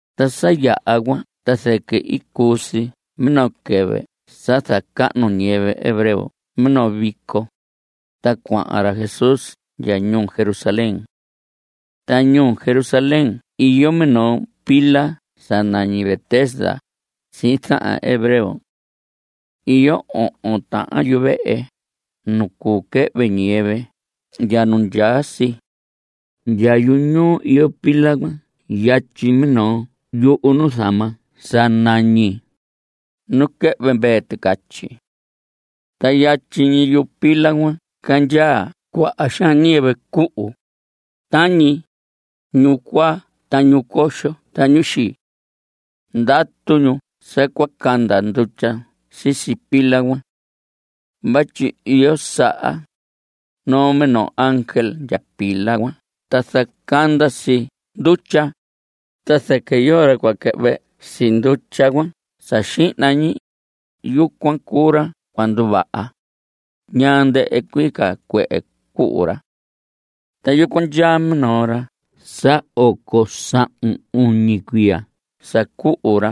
Ta sa yaha cuan ta zɨquɨ i cuu si minoo quɨvɨ sa zacahnu ñiyɨvɨ hebreo minoo vico, ta cuahan ra Jesús ndya ñuu Jerusalén. Ta ñuu Jerusalén iyo minoo pila sa nañi Betesda sihin zahan hebreo. Iyo ohon tahan yuvehe nu cuu quɨhvɨ ñiyɨvɨ ndya nu ndyaa si. Ndya yuñuu iyo pila cuan yatyi minoo yuhu nuzama sa nañi: Nu Quɨhvɨ Mvee Ticatyi. Ta yatyi ñi yu pila cuan candyaa cuaha xaan ñiyɨvɨ cuhu, tañi: ñu cuaa, ta ñu coxo, ta ñu xii. Ndatu ñu sa cua canda ndutya sisi pila cuan. Vatyi iyo saha, noo minoo ángel ndya pila cuan ta zacanda si ndutya, ta zɨquɨ yoo ra cua quɨhvɨ si ndutya cuan sa xihna ñi, yucuan cuu ra cua nduvaha, ñaa ndɨhɨ cuii ca cuehe cuhu ra. Ta yucuan ndyaa minoo ra sa oco sahun uñi cuiya sa cuhu ra.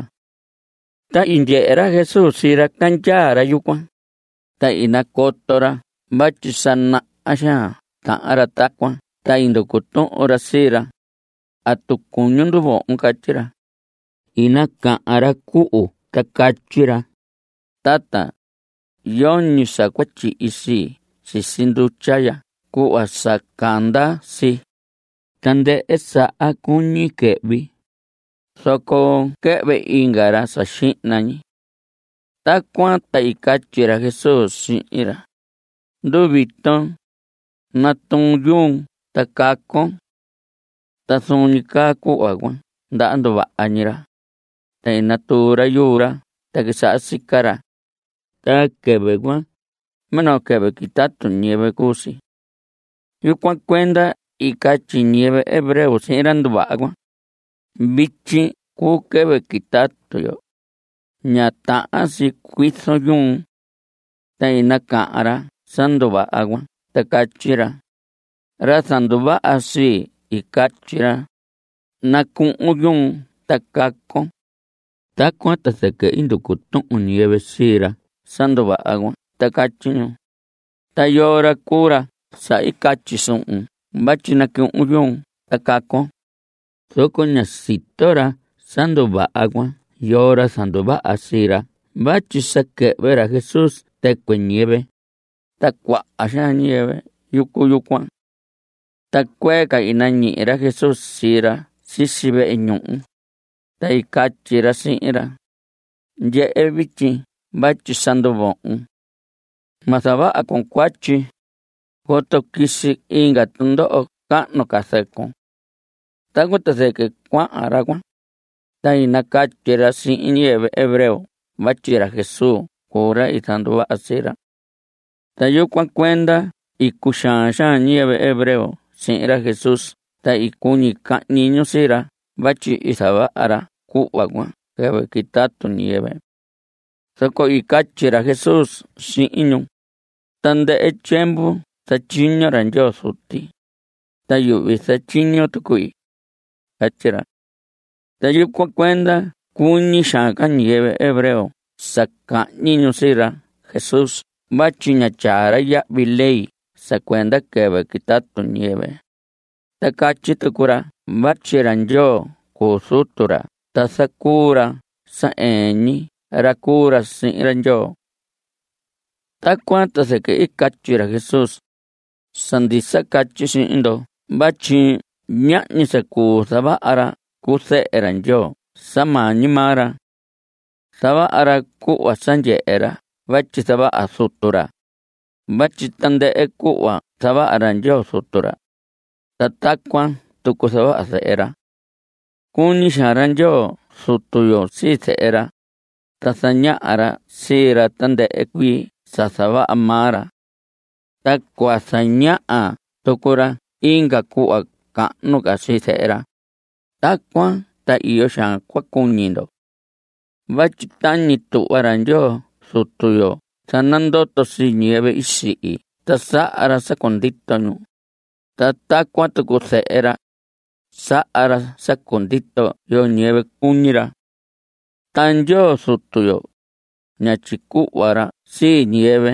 Ta i ndyehe ra Jesús sii ra candyaa ra yucuan, ta i nacoto ra vatyi sa naha xaan tahan ra tacuan, ta i nducu tuhun ra sii ra: ¿Atu cuñun nduvohon? catyi ra. I nacahan ra cuhu cuan ta catyi ra: Tata, yoñi sa cua tyihi sii sisi ndutya ya cuhva sa canda si. Tandɨhɨ saha cuñi quɨhvi, zoco quɨhvɨ inga ra sa xihna ñi. Tacuan ta i catyi ra Jesús sihin ra: Nduviton; natuun yuun ta cacon. Ta zuun ñi caa cuhva cuan ndaha nduvaha ñi ra, ta i natuu ra yuu ra ta quisaha sica ra. Ta quɨvɨ cuan, minoo quɨvɨ quitatu ñiyɨvɨ cuu si. Yucuan cuenda i catyi ñiyɨvɨ hebreo sihin ra nduvaha cuan: Vityi cuu quɨvɨ quitatu yo. Ña tahan si cuizon yuun. Ta i nacahan ra sa nduvaha cuan ta catyi ra: Ra zanduvaha sii, i catyi ra: “Nacuhun yuun ta cacon.” Tacuan ta zɨquɨ i nducu tuhun ñiyɨvɨ sii ra sa nduvaha cuan ta catyi ñu: ¿Ta yoo ra cuu ra sa i catyi suhun vatyi nacuhun yuun ta cacon? Zoco ña sito ra sa nduvaha cuan yoo ra zanduvaha sii ra vatyi sa quɨhvɨ ra Jesús tɨcuɨ ñiyɨvɨ, ta cuaha xaan ñiyɨvɨ yucu yucuan. Ta cuee ca i nañihi ra Jesús sii ra sisi vehe ñuhu, ta i catyi ra sihin ra: Ndyehe vityi vatyi sa nduvohon. Ma zavaha con cuatyi, coto quisi inga tundoho cahnu ca zɨcun. Tacuan ta zɨquɨ cuahan ra cuan, ta i nacatyi ra sihin ñiyɨvɨ hebreo vatyi ra Jesús cuu ra i zanduvaha sii ra. Ta yucuan cuenda i cuxaan xaan ñiyɨvɨ hebreo sihin ra Jesús ta i cuñi cahñi ñu sii ra vatyi i zavaha ra cuhva cuan quɨvɨ quitatu ñiyɨvɨ. Zoco i catyi ra Jesús sihin ñu: Tandɨhɨ tyiemvu zatyiño ra Ndyoo Zuti, ta yuhvi zatyiño tuqui. Catyi ra. Ta yucuan cuenda cuñi xaan ca ñiyɨvɨ hebreo sa cahñi ñu sii ra Jesús vatyi ña tyaa ra yahvi ley sa cuenda quɨvɨ quitatu ñiyɨvɨ, ta catyi tucu ra vatyi ra Ndyoo cuu Zutu ra ta zacuu ra sa ɨɨn ñi ra cuu ra sihin ra Ndyoo. Tacuan ta zɨquɨ i catyi ra Jesús: Sa ndisa catyi sihin ndo vatyi ñahñi sa cuu zavaha ra cu Zehe ra Ndyoo sa maa ñi maa ra. Zavaha ra cuhva sa ndyehe ra vatyi zavaha Zutu ra, vatyi tandɨhɨ cuhva zavaha ra Ndyoo Zutu ra, ta tacuan tucu zavaha Zehe ra. Cuñi xaan ra Ndyoo Zutu yo sii Zehe ra, ta zañaha ra sii ra tandɨhɨ cuii sa zavaha maa ra. Ta cua zañaha tucu ra inga cuhva cahnu ca sii Zehe ra, tacuan ta iyo xaan cua cuñi ndo. Vatyi tañi tuhva ra Ndyoo Zutu yo zanandoto sii ñiyɨvɨ i sihi ta saha ra sa cundito ñu, ta tacuan tucu Zehe ra, saha ra sa cundito yoo ñiyɨvɨ cuñi ra. Ta Ndyoo Zutu yo, ña tyicuhva ra sii ñiyɨvɨ.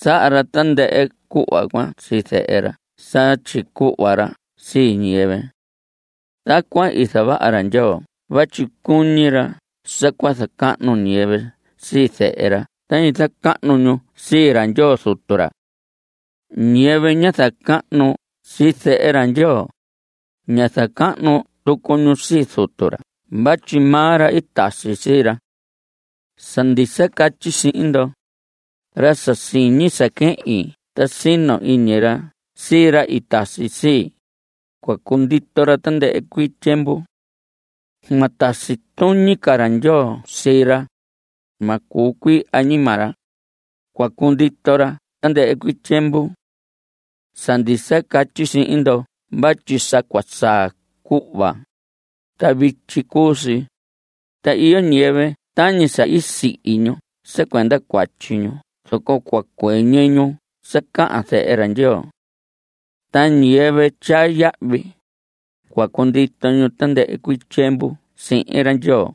Saha ra tandɨhɨ cuhva cuan sii Zehe ra sa tyicuhva ra sii ñiyɨvɨ. Tacuan i zavaha ra Ndyoo vatyi cuñi ra sa cua zacahnu ñiyɨvɨ sii Zehe ra tañi zacahnu ñu sii ra Ndyoo Zutu ra. Ñiyɨvɨ ña zacahnu sii Zehe ra Ndyoo, ña zacahnu tucu ñu sii Zutu ra vatyi maa ra i tasi sii ra. Sa ndisa catyi sihin ndo: Ra sa siñi sa quehin ta sino iñi ra sii ra i tasi sii, cua cundito ra tandɨhɨ cuii tyiemvu. Ma tasi tuñi ca ra Ndyoo sii ra. Ma cuu cuii añima ra, cua cundito ra tandɨhɨ cuii tyiemvu. Sa ndisa catyi sihin ndo vatyi sa cua saa cuhva, ta vityi cuu si, ta iyo ñiyɨvɨ tañi sa sihi ñu sa cuenda cuatyi ñu zoco cua cuɨñɨ ñu sa cahan Zehe ra Ndyoo. Ta ñiyɨvɨ tyaa yahvi, cua cundito ñu tandɨhɨ cuii tyiemvu sihin ra Ndyoo.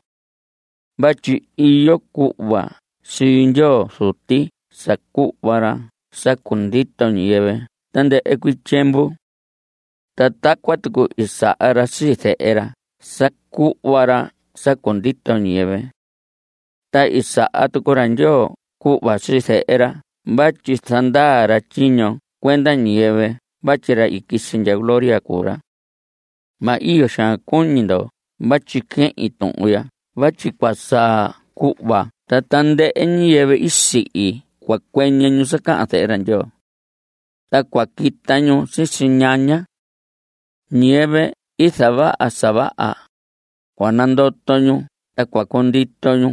Vatyi iyo cuhva sii Ndyoo Zuti sa cuhva ra sa cundito ñiyɨvɨ tandɨhɨ cuii tyiemvu. Ta tacuan tucu i saha ra sii Zehe ra sa cuhva ra sa cundito ñiyɨvɨ. Ta i saha tucu ra Ndyoo cuhva sii Zehe ra vatyi zandaa ra tyiño cuenda ñiyɨvɨ vatyi ra i quisi ndya gloria cuu ra. Ma iyo xaan cuñi ndo vatyi quehin tuhun ya vatyi cua saa cuhva ta tandɨhɨ ñiyɨvɨ i sihi cua cuɨñɨ ñu sa cahan Zehe ra Ndyoo. Ta cua quita ñu sisi ñaña. Ñiyɨvɨ i zavaha sa vaha, cua nandoto ñu ta cua cundito ñu.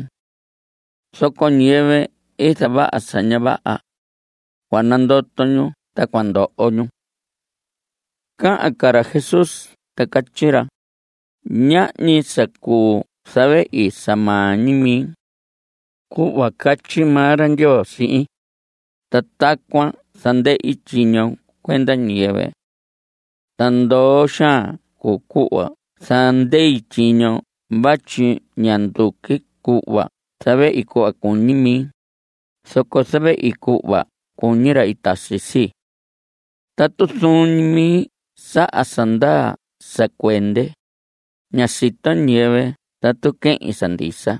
Zoco ñiyɨvɨ i zavaha sa ña vaha, cua nandoto ñu ta cua ndoho ñu. (Cahan ca ra Jesús ta catyi ra:) Ñahñi sa cuu zavehi sa maa ñi mi. Cuhva catyi maa ra Ndyoo sihin, ta tacuan zandei tyiño cuenda ñiyɨvɨ. Ta ndoo xaan cuu cuhva zandei tyiño vatyi ña nduqui cuhva zavehi cuhva cuñi mi, zoco zavehi cuhva cuñi ra i tasi sii. Tatu zuun ñi mi saha sa ndaa sa cuende, ña sito ñiyɨvɨ tatu quehin sa ndisa.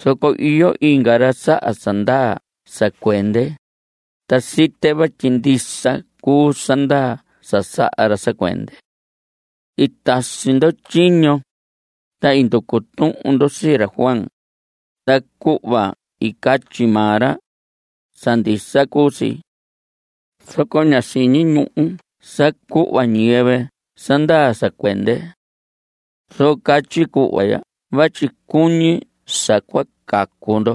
Zoco iyo inga ra saha sa ndaa sa cuende, ta site vatyi ndisa cuu sa ndaa sa saha ra sa cuende. I tasi ndo tyiño, ta i nducu tuhun ndo sii ra Juan. Ta cuhva i catyi maa ra, sa ndisa cuu si. Zoco ña siñi ñuhu sa cuhva ñiyɨvɨ sa ndaa sa cuende. Zoco catyi cuhva ya vatyi cuñi sa cua cacu ndo.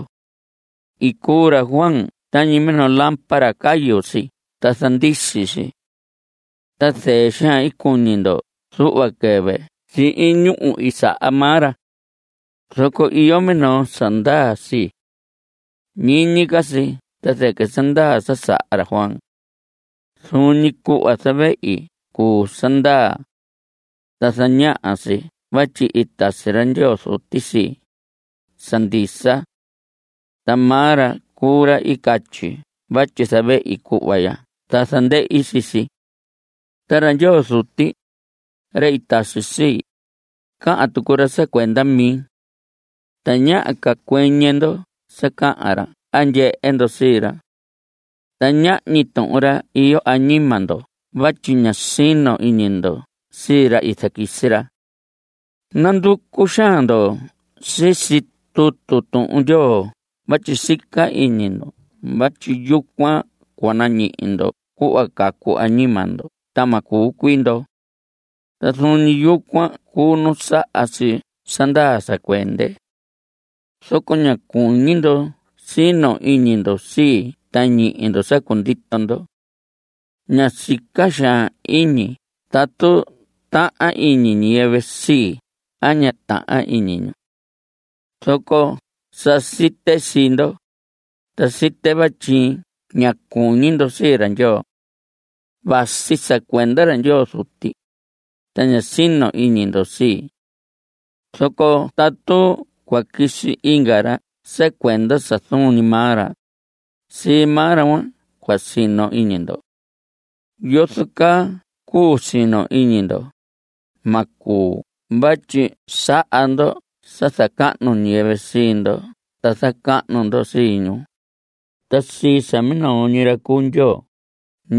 I cuu ra Juan tañi minoo lámpara. Cayu si ta zandisi si. Ta zɨɨ xaan i cuñi ndo zuhva quɨvɨ sihin ñúhu i saha maa ra. Zoco iyo minoo sa ndaa sii. Ñiñi ca si ta zɨquɨ sa ndaa sa saha ra Juan. Zuun ñi cuhva zavehi cuu sa ndaa. Ta zañaha si vatyi i tasi ra Ndyoo Zuti sii, sa ndisa. Ta maa ra cuu ra i catyi vatyi zavehi cuhva ya ta zandehi sii si. Ta ra Ndyoo Zuti, ra i tasi sii, cahan tucu ra sa cuenda mi. Tañaha ca cuɨñɨ ndo sa cahan ra a ndyehe ndo sii ra. Ta ñahñi tuhun ra iyo añima ndo vatyi ña sino iñi ndo sii ra i zaquisi ra. Nanducu xaan ndo sisi tutu Tuhun Ndyoo vatyi sica iñi ndo vatyi yucuan cua nañihi ndo cuhva cacu añima ndo ta ma cuu cuii ndo. Ta zuun ñi yucuan cuu nu saha si sa ndaa sa cuende. Zoco ña cuñi ndo sino iñi ndo sii ta ñihi ndo sa cundito ndo. Ña sica xaan iñi tatu tahan iñi ñiyɨvɨ sii a ña tahan iñi ñu. Zoco sa site sii ndo, ta site vatyi ña cuñi ndo sii ra Ndyoo. Vasi sa cuenda ra Ndyoo Zuti, ta ña sino iñi ndo sii. Zoco tatu cua quisi inga ra sa cuenda sa zuun ñi maa ra, sii maa ra cuan cua sino iñi ndo. ¿Yozo caa cuu sino iñi ndo? Ma cuu vatyi saha ndo sa zacahnu ñiyɨvɨ sii ndo ta zacahnu ndo sii ñu. Ta sii sa minoo ñi ra cuu Ndyoo,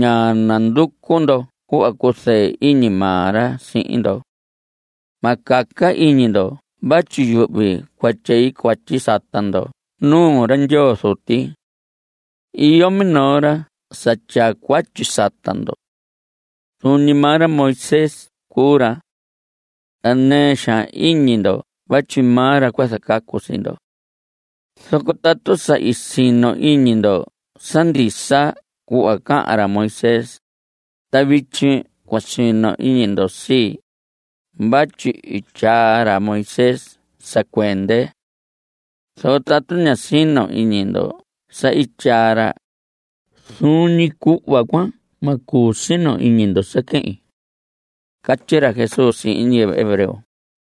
ña nanducu ndo cuhva cuzɨɨ iñi maa ra sihin ndo. Ma caca iñi ndo vatyi yuhvi cua tyei cuatyi sata ndo nuu ra Ndyoo Zuti. Iyo minoo ra sa tyaa cuatyi sata ndo. Zuun ñi maa ra Moisés cuu ra. Ta nɨɨ xaan iñi ndo vatyi maa ra cua zacacu sii ndo. Zoco tatu sa i sino iñi ndo sa ndisa cuhva cahan ra Moisés, ta vityi cua sino iñi ndo sii, vatyi i tyaa ra Moisés sa cuende. Zoco tatu ña sino iñi ndo sa i tyaa ra, zuun ñi cuhva cuan ma cuu sino iñi ndo sa quehin. (Catyi ra Jesús sihin ñiyɨvɨ hebreo cuan.)